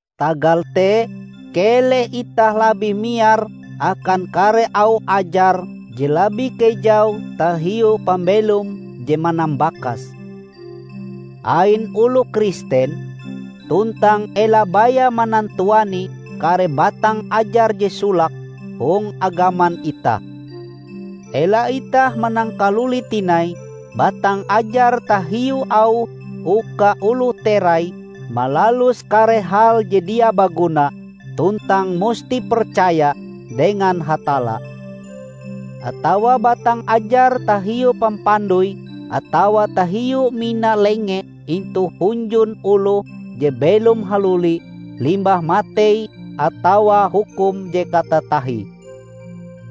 Tagal te, keleh itah labih miar akan kare auh ajar je labih kejau tahiu pambelom je manambakas, ain oloh Kristen, tuntang ela baya manantuani kare batang ajar je solake hong agaman itah. Ela itah manangkaluli tinai batang ajar tahiu auh uka oloh terai malalus kare hal je dia baguna tuntang musti percaya dengan Hatalla, atawa batang ajar tahiu pampandoi atawa tahiu mina lenge intu hunjun oloh je belom haluli limbah matei atawa hukum je katatahie.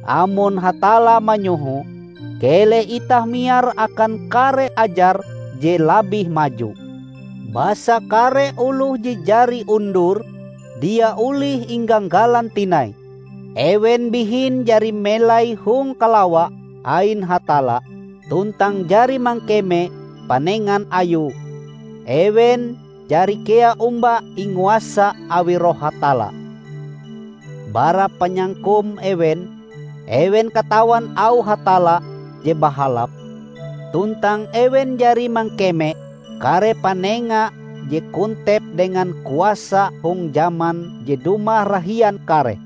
Amon Hatalla manyoho, keleh itah miar akan kare ajar je labih maju! Basa kare oloh je jari undur, dia olih ingagalan tinai. Ewen bihin jari melai hong kalawa ain Hatalla, tuntang jari mangkeme panengan Ayue. Ewen jari kea omba inguasa awi Roh Hatalla. Bara panyangkum ewen, ewen katawan auh Hatalla je bahalap, tuntang ewen jari mangkeme kare panenga je kontep dengan kuasa hong jaman je dumah rahian kareh.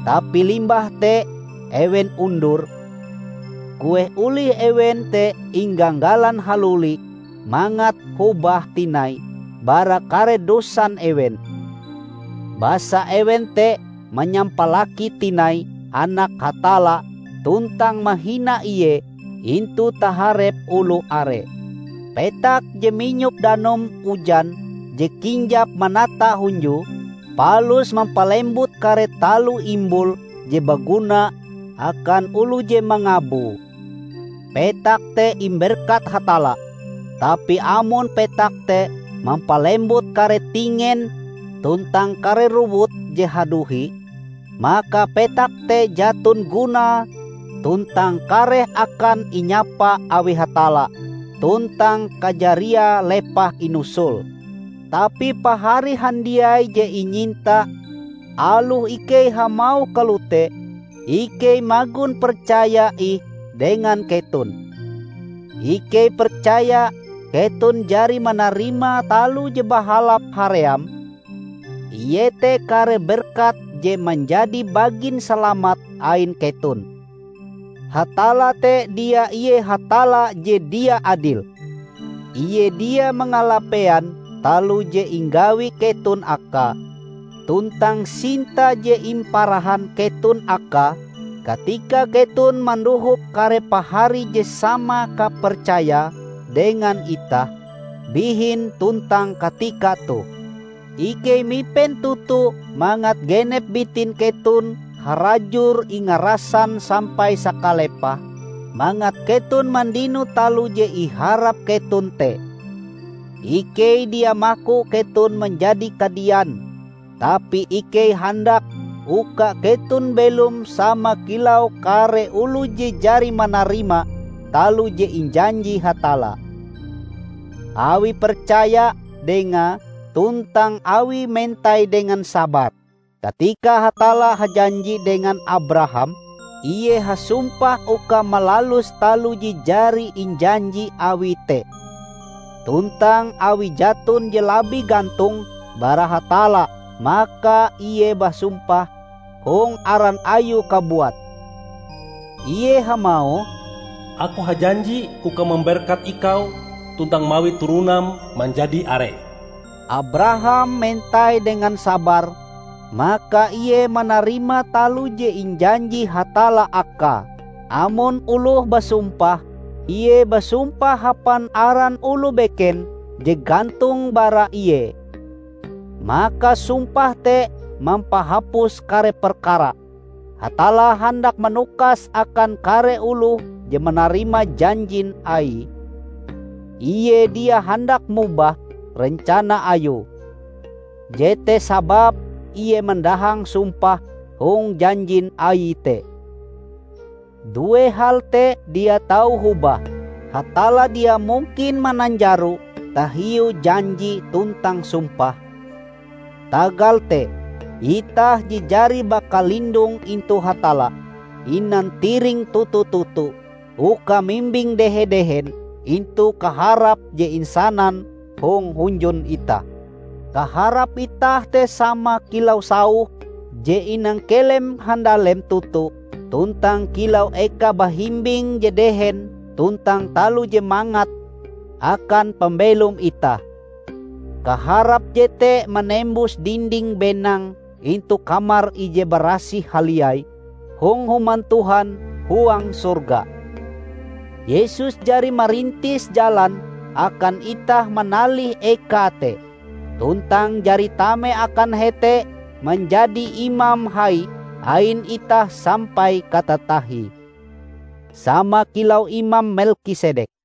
Tapi limbah te ewen undur! Kueh olih ewen te ingagalan haluli mangat hobah tinai bara kare dosan ewen. Basa ewen te manyampalaki tinai Anak Hatalla tuntang mahina Ie intu taharep oloh are. Petak je minyop danum ujan je kinjap manata hunjue, palus mampalembut kare taloh imbul je baguna akan oloh je mangaboe, petak te imberkat Hatalla. Tapi amon petak te mampalembut kare tingen tuntang kare rowut je haduhi, maka petak te jaton gunae tuntang kareh akan inyapa awi Hatalla tuntang kajariae lepah inusul. Tapi pahari handiai je inyinta, aloh ikei hamauh kalote, ikei magon percaya ih dengan keton. Ikei percaya keton jari manarima taloh je bahalap haream, iete kare berkat je manjadi bagin salamat ain keton. Hatalla te dia ie Hatalla je dia adil. Ie dia mangalapean taloh je inggawi keton Akae, tuntang sinta je imparahan keton Akae katika keton mandohop kare pahari je sama kapercayae dengan itah, bihin tuntang katika toh. Ikei mipen toto mangat genep bitin keton harajur ingarasan sampai sakalepahe, mangat keton mandino taloh je iharap keton te. Ikei dia maku keton manjadi kadian. Tapi ikei handak uka keton belom sama kilau kare oloh je jari manarima taloh je injanji Hatalla, awie percaya Dengae tuntang awie mentai dengan sabar. Katika Hatalla hajanji dengan Abraham, Ie hasumpah uka malalus taloh je jari injanji Awie te. Tuntang awi jaton je labih gantong bara Hatalla maka Ie basumpah hong aran Ayue kabuat. Ie hamauh, "Aku hajanji uka mamberkat ikau tuntang mawi turonam manjadi are." Abraham mentai dengan sabar, maka ie manarima taloh je injanji Hatalla akae. Amon oloh basumpah, ie basumpah hapan aran oloh beken je gantong bara ie, maka sumpah te mampahapus kare perkara. Hatalla handak manukas akan kare oloh je manarima janjin Aie, Ie dia handak mobah rencana Ayue. Jete sababe Ie mandahang sumpah hong janjin Aie te. Due hal te dia tau hobah: Hatalla dia mungkin mananjaro tahiu janji tuntang sumpahe. Tagal te, itah je jari bakalindong intu Hatalla, inantiring toto-toto uka mimbing dehe-dehen intu kaharap je isanan hong hunjun itah. Kaharap itah te sama kilau sauh je inangkelem handalem toto tuntang kilau eka bahimbing je dehen tuntang taloh je mangat akan pambelom itah. Kaharap jete manembus dinding benang intu Kamar Ije Barasih Haliai hong human Tuhan huang sorga. Yesus jari marintis jalan akan itah manalih eka te, tuntang jari tame akan hete manjadi Imam Hai ain itah sampai katatahie, sama kilau Imam Melkisedek.